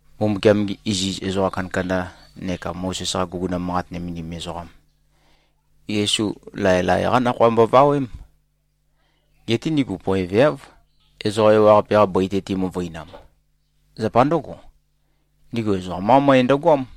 Mbumbukiam-gi iziz ezoqa kandakanda neka Mozes-qa guguna manqat nømendim ezoqam, Yesu laelae-qá nakhoa mbovawém. Geté ndigu poeveáv, ezoqa ewaqape-qa bøi-te timøvøinam. Zapa ndǿgo, ndigu ezoqam-qá møe ndøgoám.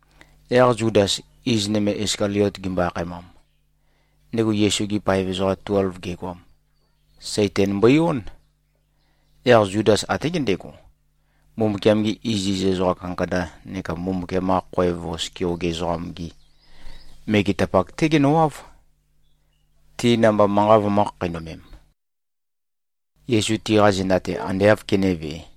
Yaq Zudas, iz nøme Iskaliot gimbo-akhaemam, ndego Yesu-gi paev ezoqa tuelv gegoam, Saitan mbøi-ón. Yaq Zudas até gendego, Mbumbukiam-gi iziz ezoqa kandakanda neka Mbumbukiam-qa khoev vos keoge ezoqam-gi megetapak-té genøwáv, ti namba manqa vømø̄-khakheinømem, Yesu tiqa zenda-te ande āv kenévē.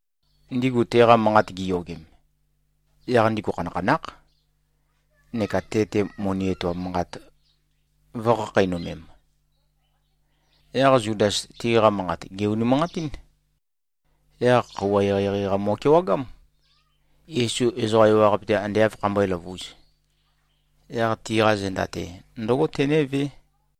Ndigu teqa manqat giyogem, yaq ndigu khanakhanákh, neka te-te moni etoam manqat vø̄khakheinømem. Yaq Zudas tiqa manqat gè-unimanqatín. Yaq khøuwa eqeieqei-qa mo꞉kewagám. Yesu ezoqa ewaqape-te ande āv khambøé-løvūz, yaq tiqa zenda-te ndǿgo tenévé.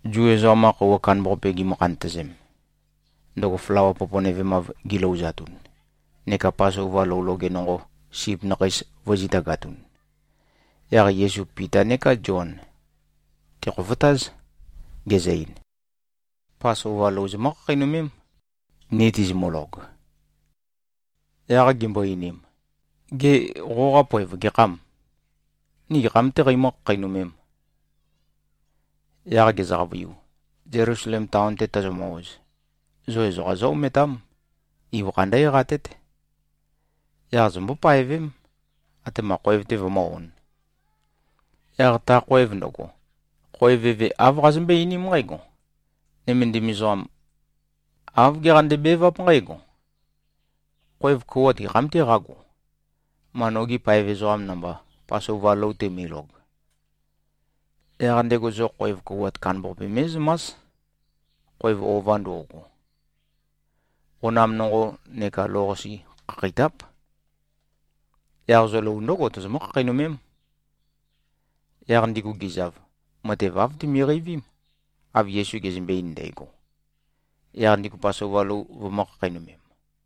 Zu ezoqam-qa khøuwa kandambaqape gimø-khantøzem, ndøgo flawa poponøvemav gilouzatun, neka Pasova lou loge nonqo sip nakheis vø̄zitagatun, yaq Yesu Pita neká Zion, tèkhofotáz, gezø-ein, “Pasova lou zomǿ-khakheinømém, ni tizimølog.” Yaq gimbo-einim, “Gê, qoqa poev gekhâm? Ni gekham-tē qeimǿ-khakheinømēm?” Yaq gezø-qavøiu, “Zelusalem taon-te tozomø-oz, zo ezoqa zó-ometám. Ibøkha ndǿ-eqatét. Yaq zombó-paevém, atema khoev-te vømǿ-ōn. Yaq ta khoev ndøgo, khoev eve āv qazømbøé-einím nqǽgo, ‘Nømendim ezoqam, āv geqande-beváp nqǽgo: Khoev kouwat gekham-tē qágo, ma nogi paev ezoqam namba, Pasova lou teimølog?’ Yaq ndego zo khoev kouwat kandambaqape mé꞉zømás, khoev ova ndo꞉go. Qonam nonqo neka lou-qase khakheitáp. Yaq zo lou ndǿgo tozomǿ-khakheinømém.” Yaq ndigu gizav, matev āv timiqeivím, av Yesu gezømbe-ein ndægo. Yaq ndigu Pasova lou vømø̄-khakheinømem.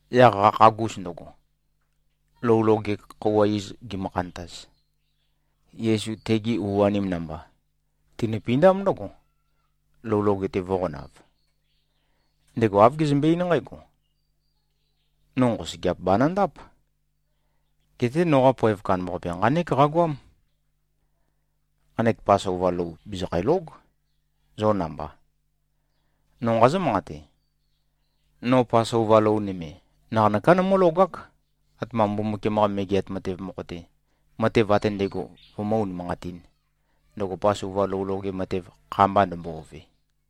Yaq qakhagus ndøgo, lou loge khøuwa iz gimø-khantaz, Yesu tegi u-anim namba, tinøpindám ndǿgo, lou loge-te vø̄qonav. Ndego āv gezømbe-eín nqǽgo, “No nqosøgeap banøndáp. Geté noqa poev kandambaqape, nqánek qagoám. Nqanek Pasova lou bìzikhælóg, zo namba. No nqazǿ-manqate: No Pasova lou nøme, naqanøká nomǿlogák, atema Mbumbukiam-qa Megeat Matev mokho-te, matev ate ndægo vømǿ-unimanqatīn, ndøgo Pasova lou loge matev kha-mba ndømbo-ove.”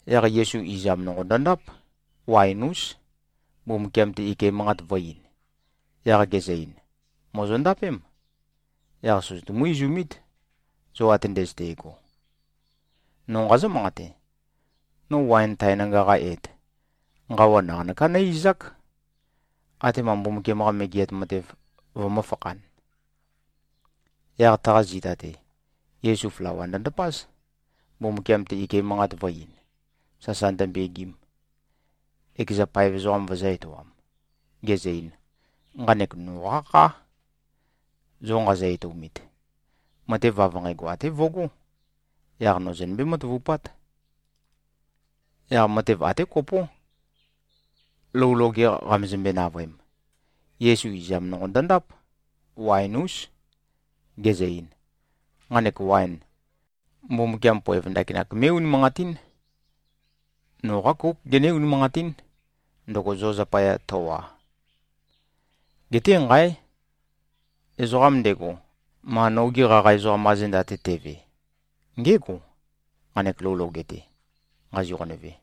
Yaq Yesu izam nonqo ndøndáp, waen-ús, Mbumbukiam-te ike manqat vø̄-ein, yaq gezø-ein, “Mòzondapém. Yaq søzøtumú-izumít, zo ate ndøzøte꞉go. No nqazǿ-manqate: No waen tae nanga-qa et, nqawa naqanøká nǿ-izák, atema Mbumbukiam-qa Megeat Matev vømǿfakhān.” Yaq taqa zita-te, Yesu flawa ndøndapáz, Mbumbukiam-te ike manqat vø̄-ein, sasa ndømbegim, ekeza paev ezoqam vøzø̄-etoam, gezø-ein, “Nqanek noqá khá, zo nqazø-etoumit. Matev av nqægo até vøgó. Yaq no zonømbé-matavupát.” Yaq matev até kopó, lou loge qamezømbe-navøem, Yesu izam nonqo ndøndáp, waen-ús, gezø-ein, “Nqanek waen, Mbumbukiam poev ndakinak mé꞉-unimanqatín. Noqá kóuk gené-unimanqatín, ndøgo zo zapaya tøwa. Geté. Nqáe! Ezoqam ndego, ma nogi qaqa ezoqam-qa zenda-te teve, ngégo, nqanek lou loge-te nqazi-qonøve.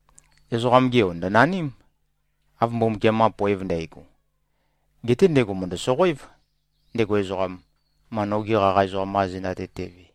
Ezoqam-ge Yo ndø̀naním, av Mbumbukiam-qa poev ndægo. Geté ndego mø̀ndø-soqoév, ndego ezoqam, ma nogi qaqa ezoqam-qa zenda-te teve.”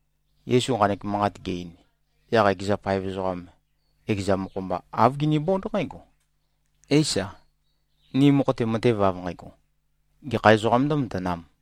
Yesu nqanek manqat ge-ein, yaq ekeza paev ezoqam ekeza mokho-mba, āv ginibónd nqǽgo, “Éisa, ni mokho-te matev av nqægo, gekha ezoqām ndǿmatanām?”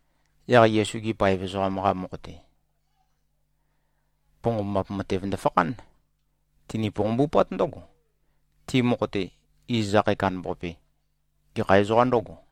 Yaq Yesu-gi paev ezoqam-qa mokho-te, ponqombap matev ndøfakhán. Tini-ponqombupát ndǿgo, ti mokho-te, iz akhae kandambaqape, gekha ezoqā ndǿgo?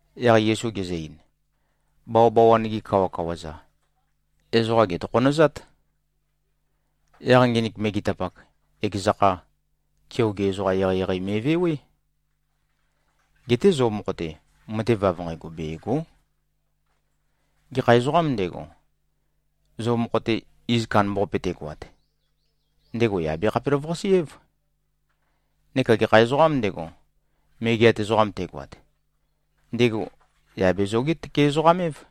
Yaq Yesu gezø-ein, “Bawabawan-gi kawakawa-za, ezoqa gètokhonøzát. Yaq nginik megetapak, ekeza kha, keoge ezoqa eqeieqei me꞉vewé. Geté zo mokho-te, matev av nqægo bègo᷄. Gekha ezoqām ndego, zo mokho-te iz kandambaqape tegoat, ndego yà be-khapelavøqase-év. Neka gekha ezoqām ndego, megeat ezoqam tegoat, ndego yà be-zoge-tøke-ezoqam-év.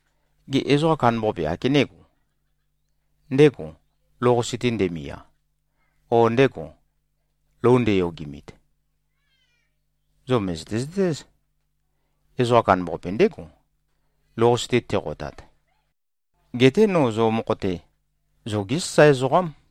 Gê, ezoqa kandambaqape ákenego? Ndégò, lou-qase-te ndemia, ó, ndégò, lou ndeyogimit? Zo mø̀zøte-zøtéz, ezoqa kandambaqape ndégo, lou-qase-te teqotat. Geté no zo mokho-te, zogé sasae ezoqám.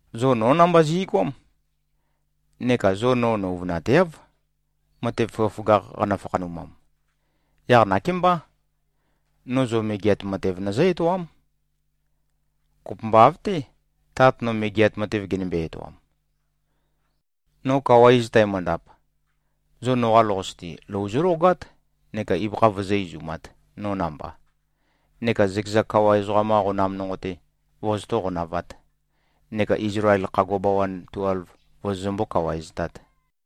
Zo nó namba zi꞉goám. Neka zo no nøuvønateáv, matev føgøføgakh qanø-fakhanumam. Yaq nakémbá. No zo Megeat Matev nøzǿ-etoám, kopømba av-té, Tat no Megeat Matev genømbe-etoam. No kawa iz tæmøndap, zo noqa lou-qase-te, lou zólogát neka ibøkha vozó-izumāt, no namba, neka zøkeza kawa ezoqam-qa qonam nonqo-te vozotó-qonavāt, neka Izlael khagua bawan tuelv vozozømbó-kawaeztāt.”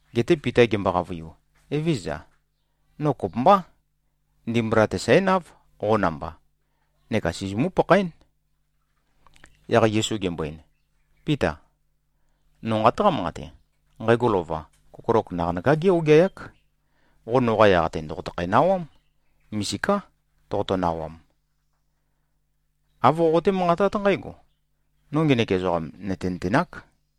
Geté Pita gembo-qavøiu, “Evézøza. No kopømbá. Ndimbula-te sǽnáv, qo namba, neka sizimú-pakhaén.” Yaq Yesu gembo-ein, “Píta! No nqataqá-manqate. Nqægo lova, kokolok naqanøká gé-ogeayák. Qo noqa yaq-te, ndòqotøkhæ-nawám. Misiká toqoto-nawam. Āv qoqoté-manqatát nqǽgo, ‘No ngenek ezoqam nø̀tenøtenāk.’”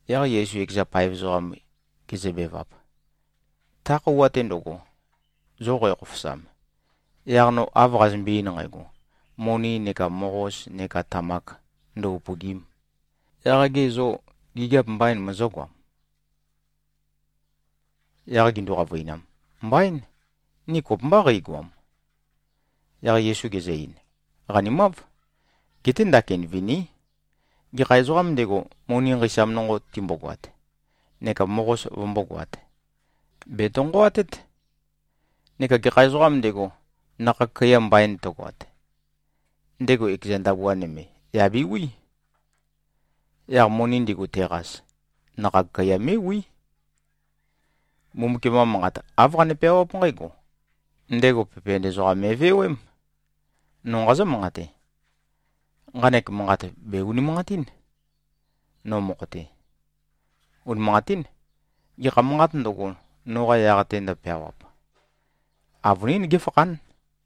Yaq Yesu ekeza paev ezoqam gezøbevap, “Ta khøuwa-te ndøgo, zo qækhofosam, yaq no av qazømbe-ein nqægo, moni neka moqos neka tamak ndø-upø̀gi᷄m, yaq ge zô, gigiap mbaīn mozógoam?” Yaq gindu-qavøinam, “Mbaín. Ni kopømbá qeigoam.” Yaq Yesu gezø-ein, “Qanimáv. Geté ndakin viní. Gekha ezoqām ndego, moni nqeisam nonqo timbogoat neka moqos vømbógoāt, bètonqoatét. Neka gekha ezoqām ndego, nakhag kaiya mbain tøgoat, ndego ekeza ndabua nøme, yà bewi. Yaq moni ndigu teqas, nakhag kaiya mé꞉wí. Mbumbukiam-qa Manqat āv qane-peawáp nqǽgo: ‘Ndego pepen ezoqam me꞉vewém.’ No nqazǿ-manqate. Nqanek manqat bè-unimanqatín, no mokho-te. Unimanqatín. Gekha manqāt ndøgo, noqa yaq-te ndøpeawap, avønín géfakhán.”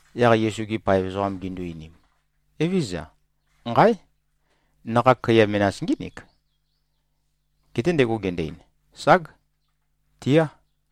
Yaq Yesu-gi paev ezoqam gindu-einim, “Evézøza. Nqáe! Nakhag kaiya menas ngínik.” Geté ndego gendo-ein, “Ság. Tiá.”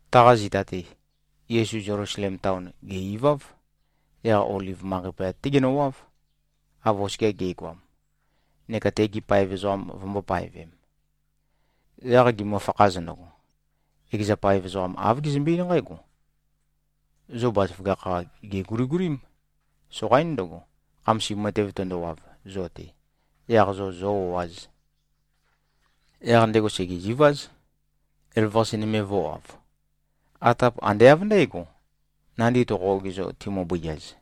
Taqa zita-te, Yesu Zelusalem taon, gè-iváv. Yaq Oliv manqei poyat-té genøwáv, av oskia ge꞉goam, neka tegi paev ezoqam vømbō-paevem. Yaq gimøfakhaz ndøgo, ekeza paev ezoqam āv gezømbe-eín nqǽgo, “Zo bazaføgakh-qa, gèguligulím. Soqaín ndøgo, khamasim matev tøndowav zo-te, yaq zo zō-o꞉āz.” Yaq ndego sègeziváz, elavøqase nøme vø̄wav. Atap ande av ndǽgo, nandi toqo-ogizo, timø-bøiaz.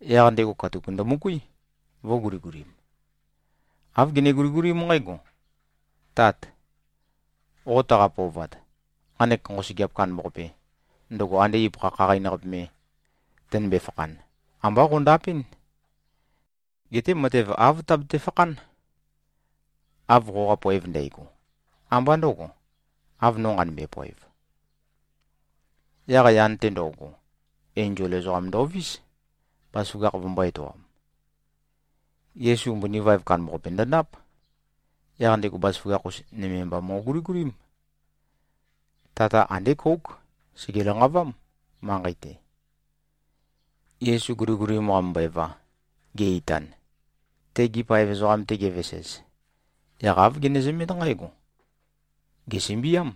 Yaq ndego katuk ndømøkuí, vø̄guligulim. Āv gene-guligulím nqǽgo, “Tát! Qo taqa-pøovat. Nqanek nqosøgeap kandambaqape, ndøgo ande ibøkha khaqain-qape me tønømbe-fakhan, ambá qøndapɨ́n. Geté matev āv tabete-fakhán, av qoqa poev ndægo. Ambá ndø̄go, av no nqanømbe-poev.” Yaq yan-te ndo꞉go, enzol ezoqam ndovís, bazaføgakh vømbō-etoam. Yesu mbøni vaev kandambaqape ndøndáp. Yaq ndego bazaføgakh-us nøme mba mo꞉guligulím. Tata andé kóuk. Sège-lanqavám, manqei-te. Yesu guligulim qamømbøeva, ge-itan, tegi paev ezoqam-te gevesez, yaq āv genezømét nqǽgo: Gèsømbiám.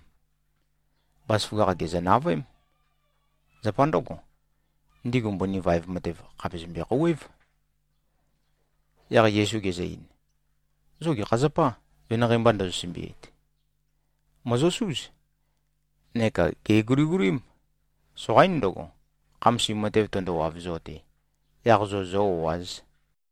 Bazaføgakh gèzø-navøém. Zapa ndǿgo, ndigu mbøni vaev matev khàpe zømbe-khouwév. Yaq Yesu gezø-ein, “Zo gekha zapâ, venanqei mba ndozo-sømbiit? Mòzosúz. Neka gèguligulím. Soqaín ndøgo, khamasim matev tøndowav zo-te, yaq zo zō-o꞉āz.”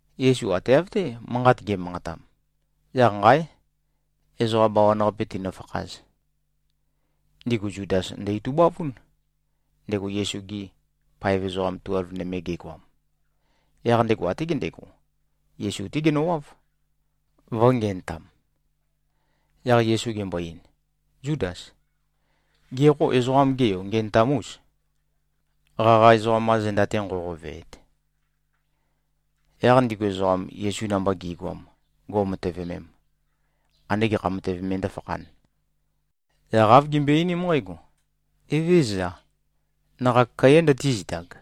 Yesu ate av-té manqat ge꞉manqatam, yaq nqáe! Ezoqa bawan-qape tīnø̄fākhāz. Ndigu Zudas ndø-itubavún, ndego Yesu-gi paev ezoqa tuelv nøme gegoam. Yaq ndego até gendego, Yesu-té genøwáv, vø̄ngenøtam. Yaq Yesu gembo-ein, “Zúdas. Gê, qo Ezoqam-ge Yo ngenøtam-ûs, qaqa ezoqam-qa zenda-te nqoqoveet?” Yaq ndigu ezoqam, Yesu namba gi꞉goam, go꞉matøvemem, ande gekha matev me ndǿfakhān, yaq āv gimbøe-einím nqǽgo, “Evézøza, nakhag kaiyā ndøtízitag?”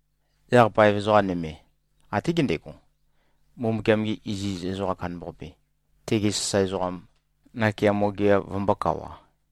Yaq paev ezoqa nøme, até gendego, Mbumbukiam-ge iziz ezoqam kandambaqape, tege sasae ezoqam, nakeamo gea vømbōkawa.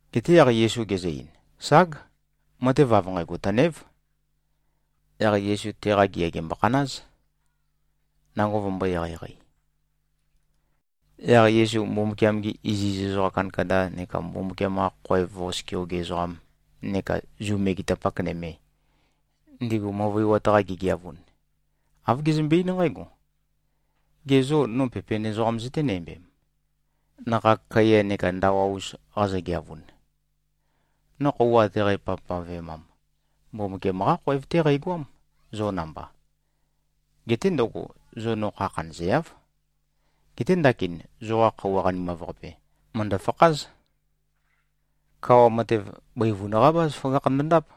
Geté yaq Yesu gezø-ein, “Ság. Matev av nqægo tønév.” Yaq Yesu teqa gea gèmbokhanáz, nango vømbō-eqeieqei. Yaq Yesu Mbumbukiam-gi iziz ezoqa kandakanda neka Mbumbukiam-qa khoev vos keoge ezoqam neka Zu megetapak nøme, ndigu møvøiwat-qa gigeavun, āv gezømbe-eín nqǽgo, “Ge zô, no pepen ezoqam zøténæmbem, nakhag kaiya neka ndawa-us qazogeavun? No khøuwa ate qæpavpavemam, Mbumbukiam-qá khoev-té qæqoám, zo namba. Geté ndøgo, zo no kha khanøzeáv. Geté ndakin, zoqa khøuwa qanimav-qape mø̀ndø-fakház. Kawa matev, bøivun-qá bazaføgakh ndøndáp.”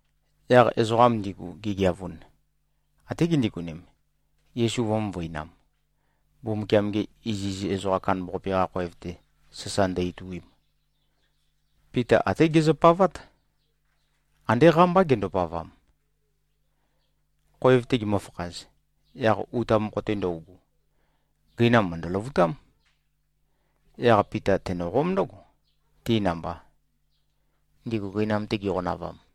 Yaq ezoqam ndigu gigeavun, até gindigonem, Yesu vø̄-møvøinam, Mbumbukiam-ge iziz ezoqam kandambaqape-qa khoev-te sasa ndø-ituim. Pita até gezøpavát. Andé qámbá gendopavam. Khoev-te gimøfakhaz, yaq uta mokho-te ndøugu, gøinam mø̀ndø-løvutám. Yaq Pita tenøqóm ndǿgo, ti namba, ndigu gøinam-te giqonavam.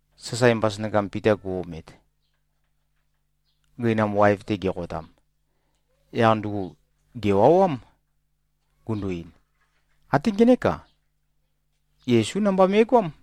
Sasae mbasønakam Pita gu-omet, gøinam waev-te geqotam, yaq ndugu gèwawám, gundu-ein, “Até ngenék-a, Yesú namba me꞉goám!”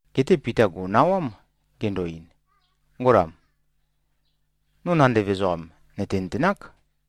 Geté Pita gò꞉nawám, gendo-ein, “Ngolam, no nandev ezoqam, nø̀tenøtenák.”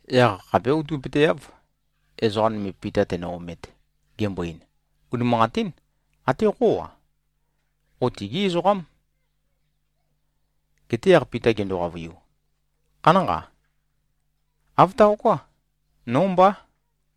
Yaq khapé outøpøteáv, ezoqa nøme Pita tēnø̄-ōmēt, gembo-ein, “Unimanqatín. Até qó-a, qo tigí ezoqám.” Geté yaq Pita gendo-qavøiu, “Khanánqa. Āv taoká. Nó mbá.”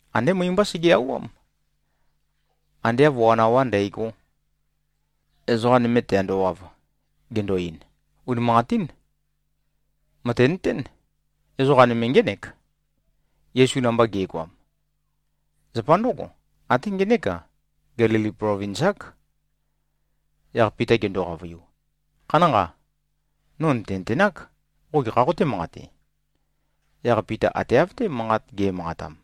Andé møi-mbá sege-auwám. Ande av wan awá ndægó, ezoqa nøme tēāndōwāv, gendo-ein, “Unimanqatín. Mø̀tenøtén. Ezoqa nøme ngének, Yesu namba ge꞉goam. Zapa ndǿgo, até ngenék-a, Gelili plovins-ák.” Yaq Pita gendo-qavøiu, “Khanánqa. No nø̀tenøtenák, qo gekhā qotē-manqate.” Yaq Pita ate av-té manqat ge꞉manqatam,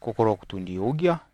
kokolok tùndi-ogeá.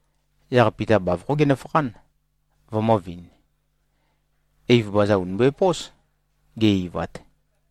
Yaq Pita bavokhó genøfakhán, vømø̄vin. Eiv baza ùni mbøepós, ge-eivat.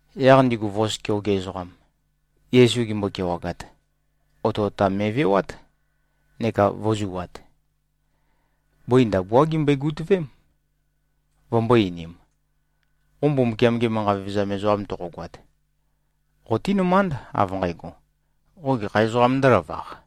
Yaq ndigu vos keoge ezoqam, Yesu gimbo-kewagat, otøotam me꞉vewát neka vø̄zuat. Bøi ndabuá gimbøe-gutøvém, vømbō-einim, “Qo Mbumbukiam-ge manqa vevezam ezoqam toqogoat, qotínømánd, av nqægo, qo gekha ezoqām ndǿlavaq?”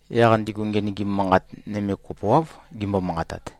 Yaq ndigu ngenøgim manqat nøme kopoáv gimbo-manqatat.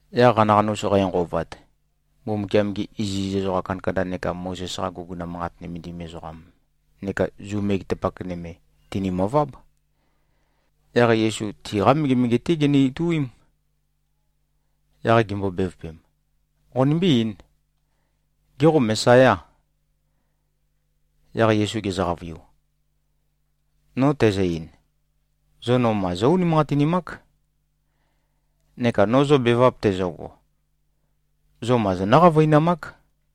Yaq qanaqanus qænqovat, Mbumbukiam-gi iziz ezoqa kandakanda neka Mozes-qa guguna manqat nømendim ezoqam neka Zu megetapak nøme tìnimøváb. Yaq Yesu tiqá megemege-té ginø-ituím. Yaq gimbo-bevøpem, “Qonimbí-eīn. Gê, qo Mesayâ?” Yaq Yesu gezø-qavøiu, “No tæzø-ein, zo no ma zó-unimanqatinimák. Neka no zo bevap tæzøgo, zo ma zonǿ-qavøinamák.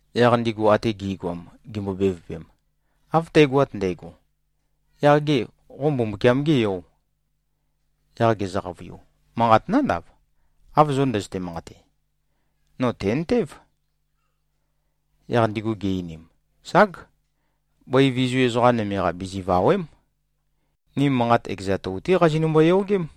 Yaq ndigu ate gi꞉goam gimbo-bevøpem, “Av tægoat ndægo, yaq gê, qo Mbumbukiam-gê Yò?” Yaq gezø-qavøiu, “Manqat nándav, av zo ndøzøte-manqate. No tèntév.” Yaq ndigu gi-einim, “Ság! Bøi vizu ezoqa nøme-qa bizivàwe᷄m. Ni manqat ekeza tou-té qazinømbo-yogém.”